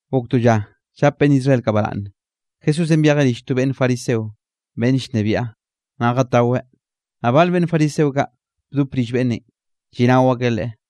Gok to lla llap beꞌnn Israel kaꞌ baraꞌnne, Jesúsenꞌ byejeꞌ rill to beꞌnn fariseo beꞌnn llnebiaꞌ, naꞌ jataweꞌ, naꞌ bal beꞌnn fariseo kaꞌ bdop rill beꞌnnenꞌ, lliꞌnao akeꞌ Leꞌe.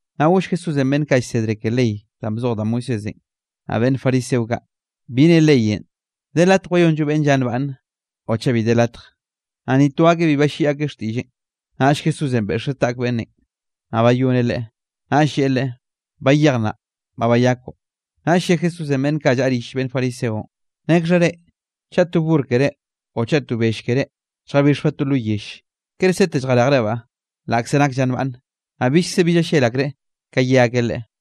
Naꞌ goll Jesúsenꞌ beꞌnn kaꞌ llsedre ke ley danꞌ bzoj da Moisésenꞌ, naꞌ beꞌnn fariseo kaꞌ: —¿Bi ne leyenꞌ? ¿De latj wayonllo beꞌnn lla nbaꞌnne o chaꞌ bi de latj? Naꞌ ni to akeꞌ bi balliꞌi xtiꞌlleꞌn. Naꞌll Jesúsenꞌ beꞌxeꞌ taꞌk beꞌnnenꞌ, naꞌ bayoneꞌ leꞌe, naꞌll lleꞌe leꞌe: —Bayej nnaꞌ, ba bayakoꞌ. Naꞌll lle Jesúsenꞌ beꞌnn kaꞌ llaꞌa rill beꞌnn fariseonꞌ: —Nekxha reꞌ, chaꞌ to burr keré o chaꞌ bell keré lljabixbaꞌ to lo yelle, ¿kere sete lljarejrebaꞌ, laꞌkze nak lla nbaꞌnne? Naꞌ billkze bi llallel akreꞌ ka ye akeꞌ Leꞌe.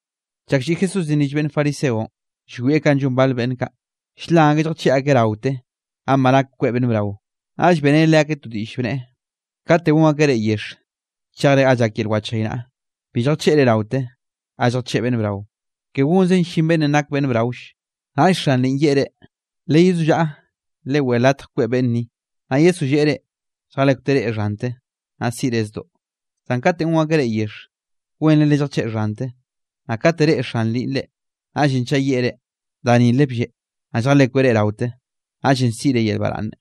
Chak lliꞌ Jesúsenꞌ rill beꞌnn fariseonꞌ, llwieꞌ kanꞌ llon bal beꞌnn kaꞌ, ll-lan akeꞌ lljacheꞌ akeꞌ raote ga ba nak kweꞌ beꞌnn brao, naꞌll beꞌreneꞌ leakeꞌ to diꞌll, bneꞌe: —Kate gon akeꞌ reꞌ yexh chejre ga llak yel wchaynaꞌa, bi lljacheꞌre raote ga lljacheꞌ beꞌnn brao, ke gonzen llin beꞌnnenꞌ nak beꞌnn braoll. Naꞌll xan lnni yeꞌe reꞌ: “Leyezollaꞌa, leweꞌe latj kweꞌ beꞌnn ni.” Naꞌ yesolleꞌe reꞌ, lljalekwteꞌ reꞌ xhante, naꞌ siꞌre zdoꞌ. Zan kate gon akeꞌ reꞌ yexh, wenre lelljacheꞌ xhante, naꞌ kate reꞌe xan lnninꞌ reꞌ, naꞌllenꞌ chaꞌ yeꞌe reꞌ: “Da nile blleꞌ.” Naꞌ lljalekweꞌ reꞌ raote, naꞌllenꞌ siꞌre yel baraꞌnne.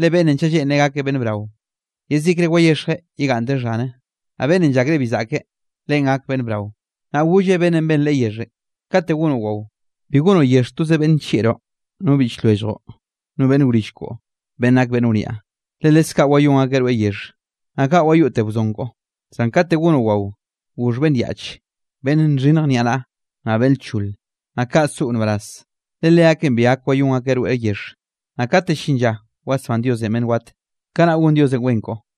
Le beꞌnnenꞌ chaꞌ lleꞌnreꞌ gakeꞌ beꞌnn brao, yezikre wayexjeꞌ yegaꞌnnteꞌ xhane, naꞌ beꞌnnenꞌ llakreꞌ bi zaꞌke, leꞌen gak beꞌnn brao. Naꞌ golleꞌ beꞌnnenꞌ ben Leꞌe yexhenꞌ: —Kate gonoꞌ wao, bi gonoꞌ yexh toze beꞌnn nllieꞌroꞌ, no biꞌch lwelljoꞌ, no beꞌnn wrill koꞌo beꞌnn nak beꞌnn wniaꞌ, le leskaꞌ wayón akeꞌ rweꞌ yexhe, naꞌ kaꞌ wayoꞌteꞌ wzon koꞌo. Zan kate gonoꞌ wao, goxh beꞌnn yaꞌche, beꞌnn nxhinnj niaꞌnaꞌa, naꞌ beꞌnn lchole. Naꞌ kaꞌ soꞌo nbaraz, le leakeꞌn bi gak wayón akeꞌ rweꞌ yexhe. Naꞌ kate llin lla wasbán Diosenꞌ beꞌnn wat, kanaꞌ gon Diosenꞌ wen koꞌo.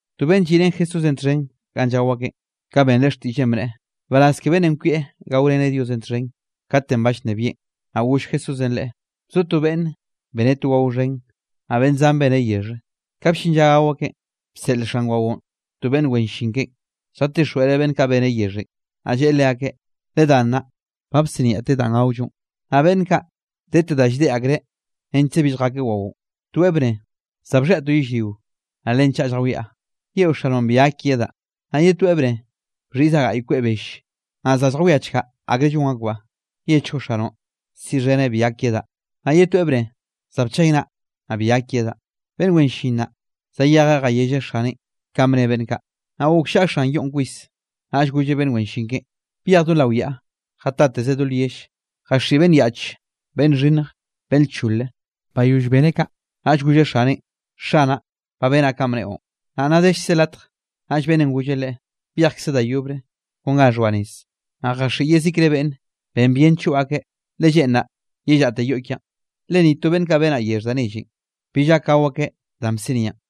To beꞌnn lliꞌrén Jesúsenꞌ txhen ganꞌ llao akeꞌn, ka benreꞌ xtiꞌlleꞌn, bneꞌe: —Nbaraz ke beꞌnnenꞌ kwieꞌ gaoreneꞌ Diosenꞌ txhen, katenꞌ ba llnebieꞌn. Naꞌ goll Jesúsenꞌ leꞌe: —Bzo to beꞌnne, beneꞌ to wao xhen, naꞌ beꞌnn zan beneꞌ yexhe. Ka bllin lla gao akeꞌn, bseꞌl xan waonꞌ to beꞌnn wen llin keꞌen, lljatixjweꞌreꞌ beꞌnn kaꞌ beneꞌ yexhenꞌ, naꞌ lleꞌe leakeꞌ: “Ledá nnaꞌ, ba bsiniaꞌte danꞌ gaollonꞌ.” Naꞌ beꞌnn kaꞌ, dete da lldeꞌ akreꞌ nechkze bi lljakeꞌ waonꞌ. Toeꞌ bneꞌe: “Za bxhiaꞌ to yellrio, naꞌ len chaꞌa lljawiaꞌ. Yeꞌo xanoꞌn bi gak yedaꞌ.” Naꞌ ye toeꞌ bneꞌe: “Bxhiꞌzaꞌ gaꞌy kweꞌ belle, naꞌ za lljawiachkaꞌ akre llon akbaꞌ. Yechgoꞌ xanoꞌn, siꞌxheneꞌ bi gak yedaꞌ.” Naꞌ ye toeꞌ bneꞌe: “Za bchaynaꞌ, naꞌ bi gak yedaꞌ.” Beꞌnn wen llin naꞌ, zayejeꞌ jayelleꞌ xaneꞌn kanꞌ bne beꞌnn kaꞌ, naꞌ gokllaꞌa xan yoꞌn kwis, naꞌll golleꞌ beꞌnn wen llin keꞌen: “Byej do lao yaꞌa, jatateze do lyell, jaxiꞌi beꞌnn yaꞌch, beꞌnn xhinnj, beꞌnn lchole.” Bayoll beneꞌ kaꞌ, naꞌll golleꞌ xaneꞌn: “Xanaꞌ, ba benaꞌ kanꞌ bneꞌon, naꞌ nna dellkze latj.” Naꞌll beꞌnnenꞌ golleꞌ leꞌe: “Byejkze da yobre kon ga xhoa nez, naꞌ jaxiꞌi yezikre beꞌnne, ben bien choꞌ akeꞌ, le lleꞌnraꞌ yellaꞌte yoꞌ kiaꞌn. Le ni to beꞌnn kaꞌ benaꞌ yexh da nellenꞌ, bill gak gao akeꞌ danꞌ bsiniaꞌn.”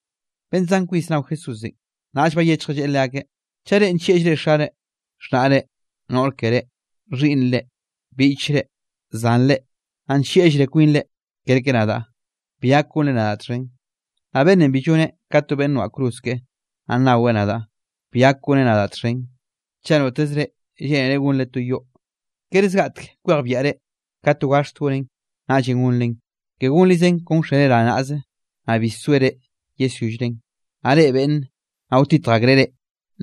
Beꞌnn zan kwis nao Jesúsenꞌ, naꞌll bayechjeꞌ lleꞌe leakeꞌ: —Chaꞌ reꞌ nllieꞌllre xare, xhnaꞌre, noꞌr keré, xhiꞌnnre, biꞌchre, zanre, naꞌ nllieꞌllre kwinre kerke nadaꞌ, bi gak gonre nadaꞌ txhen. Naꞌ beꞌnnenꞌ bi lloneꞌ ka to beꞌnn noaꞌ cruz keꞌe, naꞌ nnaweꞌ nadaꞌ, bi gak goneꞌ nadaꞌ txhen. Chaꞌ notezre lleꞌnere gonre to yoꞌ, ¿kere zgaꞌtek kwejbiaꞌre ka to gaxt gonen, naꞌllenꞌ gonren? Ke gonrizen kon wxere rane naꞌze, naꞌ bi soere yesyollren; naꞌ reꞌe beꞌnne, naꞌ wtitj akreꞌ reꞌ,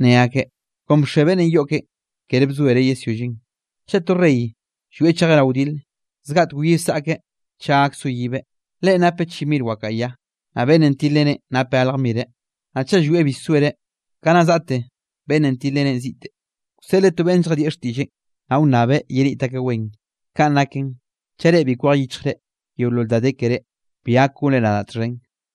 ne akeꞌ: “Kon bxe beꞌnnenꞌ yoꞌ keꞌen; kere bzoereꞌ yesyolleꞌn.” Chaꞌ to rey llwieꞌ chejeꞌ rao wdil, zgaꞌtek wyi wsaꞌkeꞌ chaꞌ gak soyibeꞌ; leꞌen napeꞌ chi mir wakaꞌa ya, naꞌ beꞌnnenꞌ tilreneꞌn napeꞌ galj mireꞌ. Naꞌ chaꞌ llwieꞌ bi soereꞌ, ka nna zaꞌte beꞌnnenꞌ tilreneꞌn ziꞌte, wseꞌleꞌ to beꞌnn lljadieꞌ xtiꞌlleꞌn, naꞌ wnnabeꞌ yeniꞌt akeꞌ wen. Kaꞌn naken, chaꞌ reꞌ bi kwej yichjre yeolol da de keré, bi gak gonre nadaꞌ txhen.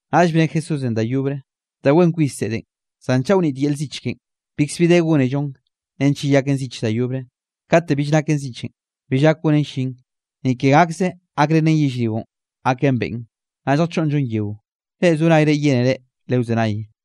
Naꞌll bne Jesúsenꞌ da yobre: —Da wen kwis zeꞌdenꞌ, zan chaꞌ wnit yel zich keꞌen, bikzbi de gónellon nench yeyaken zich da yobre. Kate bill naken zichenꞌ, bill gak gonen llin, ni ke gakze gakrenen yellrionꞌ gaken beꞌn, naꞌll lljachoꞌnnllon yeo. Reꞌ zo nayre yénere lewzenay.